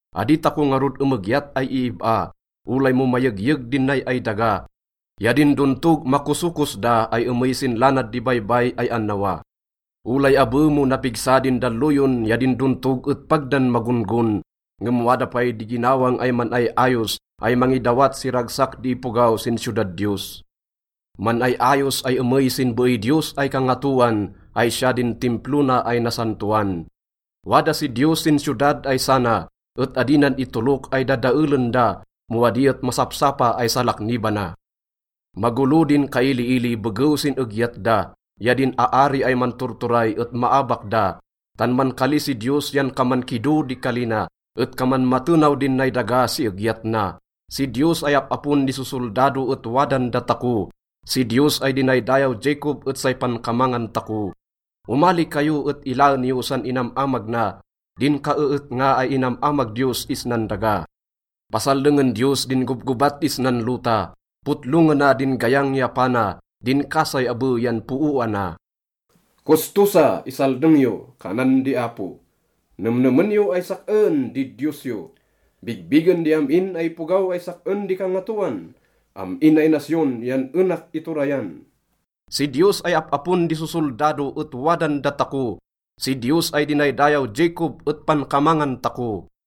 Adi tako ngarud emegyat ay iib-a, olay mo mayegyeg din nay ay daga ya din dontog makosokos da ay emey sin lanad di baybay ay annawa. Olay abe mo napigsa din dalloyon ya din dontog et pag dan magon-gon. Ngem wada pay di ginawang ay man-ay-ayos ay mangidawat si ragsak di ipogaw sin siyodad Diyos. Man-ay-ayos ay emey sin beey Diyos ay Kangatoan ay siya din Timplo na ay nasantoan. Wada si Diyos sin siyodad ay sana, et adi nan itolok ay dadaelen da mo adi et masapsapa ay salaknibana. Magolo din kailiili begew sin egyat da, ya din aari ay manturturay et maabak da, tan mankali si Diyos yan kaman kido di kali na, et kaman matenaw din nay daga si egyat na. Si Diyos ay Ap-apon di Sosoldado et wadan datako, si Diyos ay dinaydayaw Jacob et say pankamangan tako. Omali kayo et ilaen yo san inam-amag na, din kaeetnga ay inam-amag Diyos isnan daga. Pasaldengen Diyos din gobgobat isnan lota, potlongena din gayang ya pana, din kasay abe yan pooana. “Kosto sa! Isaldeng yo!” kanan di Apo. “Nemnemen yo ay sak-en di Diyos yo. Bigbigen di am-in ay ipogaw ay sak-en di kangatoan. Am-in ay nasyon yan enak iturayan.” Si Diyos ay Ap-apon di Sosoldado et wadan datako, si Diyos ay dinaydayaw Jacob et pankamangan tako.